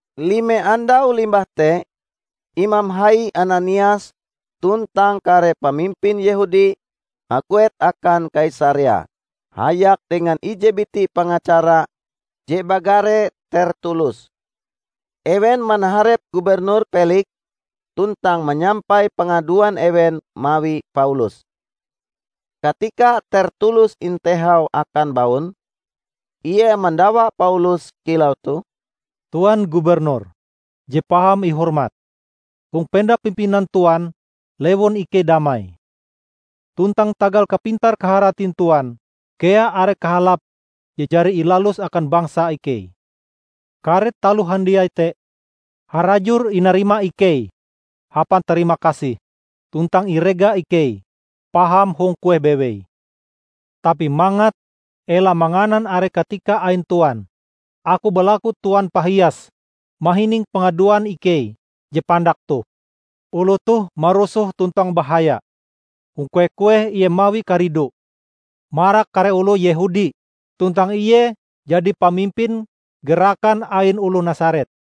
Lime andau limbah te, Imam hai Ananias tuntang kare pamimpin Yehudi haguet akan Kaisarea hayak dengan ije biti pengacara je bagare Tertulus. Ewen manaharep Gubernur Peliks tuntang manyampai pangaduan ewen mawi Paulus. Katika Tertulus intehau akan baun, ie mandawa Paulus kilau toh, "Tuan Gubernur je paham ihormat! Hong penda pimpinan Tuan lewun ikei damai. Tuntang tagal kapintar-kaharatin Tuan kea are kahalap je jari ilalus akan bangsa ikei. Kare taloh handiai te harajur inarima ikei hapan tarima kasih tuntang irega ikei paham hong kueh bewei. Tapi mangat ela manganan are katika ain Tuan, aku balaku Tuan pahias mahining pangaduan ikei je pandak toh. Oloh toh marusoh tuntang bahaya. Hong kueh-kueh ie mawi karidu marak kare oloh Yehudi tuntang ie jadi pamimpin gerakan ain oloh Nasaret.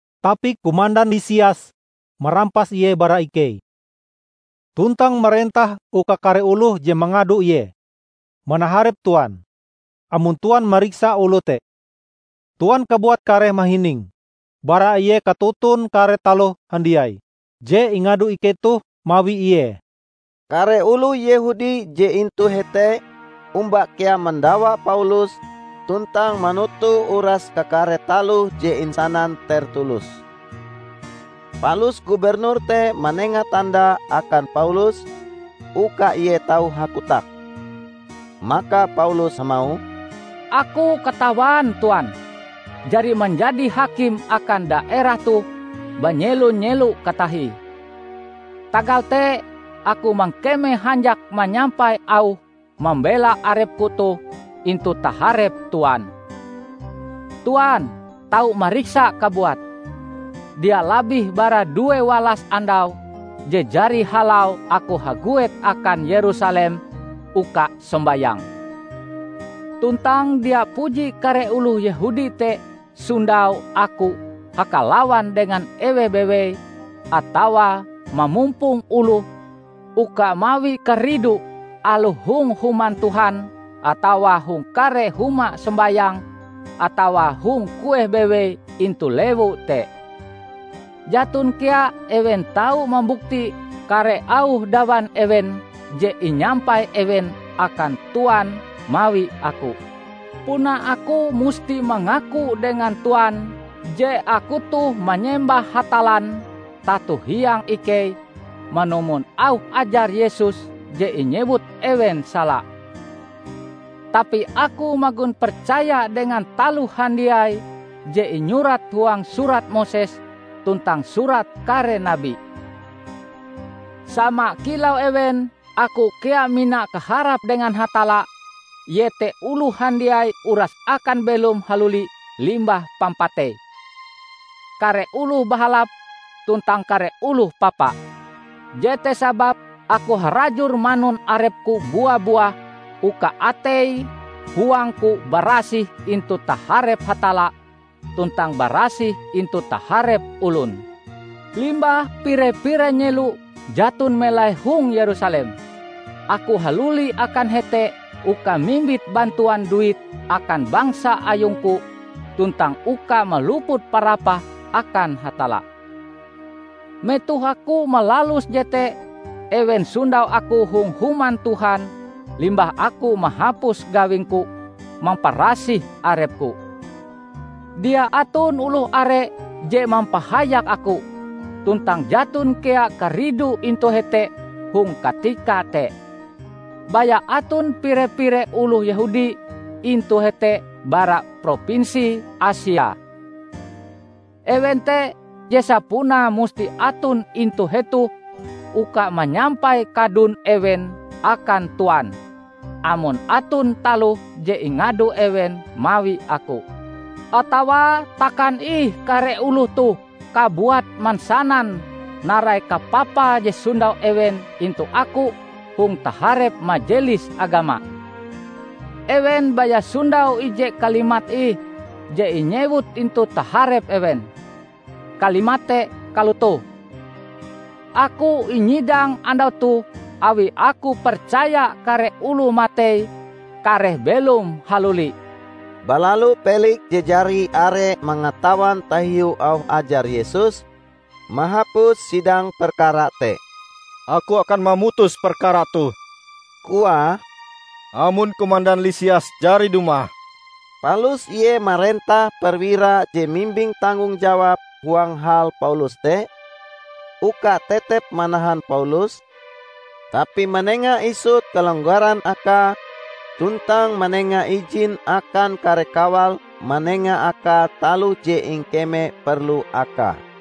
Tapi komandan Lisias marampas ie bara ikei, tuntang marentah uka kare oloh je mangado ie manaharep Tuan.] Amon Tuan mariksa oloh te, Tuan kabuat kareh mahining bara ie katoton kare taloh handiai je ingado ikei toh mawi ie." Kare oloh Yehudi je intu hete omba kea mandawa Paulus tuntang manoto uras kakare taloh je insanan Tertulus. Palus gubernur te manenga tanda akan Paulus uka ie tau hakotak. Maka Paulus hamauh, "Aku katawan Tuan jari manjadi hakim akan daerah toh banyelo-nyelo katahie. Tagal te aku mangkeme hanjak manyampai auh mambela arepku toh intu taharep Tuan. Tuan tau mariksa kabuat, dia labih bara due walas andau je jari halau aku haguet akan Yerusalem uka sombayang. Tuntang dia puji kare oloh Yehudi te sondau aku hakalawan dengan eweh bewei atawa mamumpong oloh uka mawi karidu aloh hong human Tuhan atawa hong kare huma sombayang atawa hong kueh bewei intu lewu te. Jaton kea ewen tau mambukti kare auh dawan ewen je inyampai ewen akan Tuan mawi aku. Puna aku musti mangaku dengan Tuan je aku toh manyembah Hatallan tato hiang ikei manumon auh ajar Yesus je inyewut ewen sala. Tapi aku magon percaya dengan taloh handiai je inyurat huang Surat Moses tuntang Surat Kare Nabi. Sama kilau ewen, aku kea mina kaharap dengan Hatalla iete oloh handiai uras akan belom haluli limbah pampatei -- kare oloh bahalap, tuntang kare oloh papa! Jete sababe aku harajur manun arepku bua-buah uka atei huangku barasih intu taharep Hatalla tuntang barasih intu taharep olon. Limbah pire-pire nyelo jaton melai hong Yerusalem, aku haluli akan hete uka mimbit bantuan duit akan bangsa ayungku tuntang uka maluput parapah akan Hatalla. Metoh aku malalus jete ewen sondau aku hong Human Tuhan limbah aku mahapus gawingku mamparasih arepku. Dia aton oloh are je mampahayak aku, tuntang jaton kea karidu intu hete hong katika te. Baya aton pire-pire oloh Yehudi intu hete bara propinsi Asia. Ewen te je sapunae musti aton intu hetoh uka manyampai kadun ewen akan Tuan, amon aton taloh je ingado ewen mawi aku. Atawa takan ih kare oloh toh kabuat mansanan narai kapapa je sondau ewen intu aku hong taharep Majelis Agama. Ewen baya sondau ije kalimat ih je inyewut intu taharep ewen, kalimat te kalotoh: aku inyidang andau toh awi aku percaya kare oloh matei kareh belom haluli." Balalu Peliks je jari are mangatawan tahiu auh ajar Yesus, mahapus sidang perkara te. "Aku akan mamutus perkara toh," koae, "amon komandan Lisias jari dumah." Palus ie marentah perwira je mimbing tanggong jawab huang hal Paulus te, uka tetep manahan Paulus, tapi manenga isut kalonggaran akae tuntang manenga ijin akan kare kawale manenga akae taloh je ingkeme perlu akae.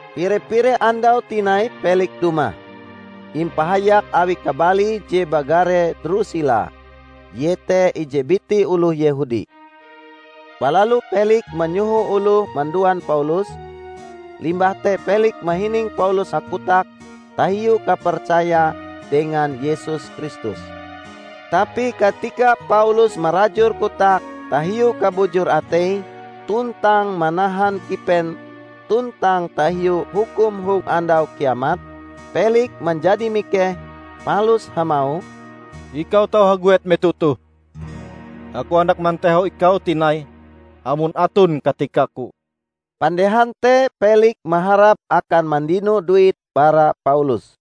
Pire-pire andau tinai Peliks dumah, impahayak awi kabalie je bagare Drusila; ie te ije biti oloh Yehudi. Balalu Peliks manyoho oloh manduan Paulus, limbah te Peliks mahining Paulus hakotak tahiu kapercaya dengan Yesus Kristus. Tapi katika Paulus marajur kotake tahiu kabujur atei tuntang manahan kipen tuntang tahiu hukum hong Andau Kiamat, Peliks manjadi mikeh palus hamauh, "Ikau tau haguet metoh toh. Aku handak mantehau ikau tinai amon aton katikaku." Pandehan te Peliks maharap akan mandino duit bara Paulus.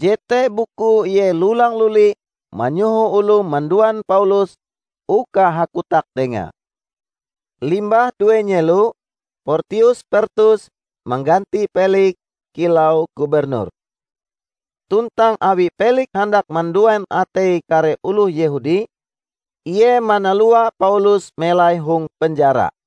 Jete bukue ie lulang-luli manyoho oloh manduan Paulus uka hakotak dengae. Limbah due nyelo, Portius Pertus mangganti Peliks kilau gubernur. Tuntang awi Peliks handak manduan atei kare oloh Yehudi, ie manalua Paulus melai hong penjara.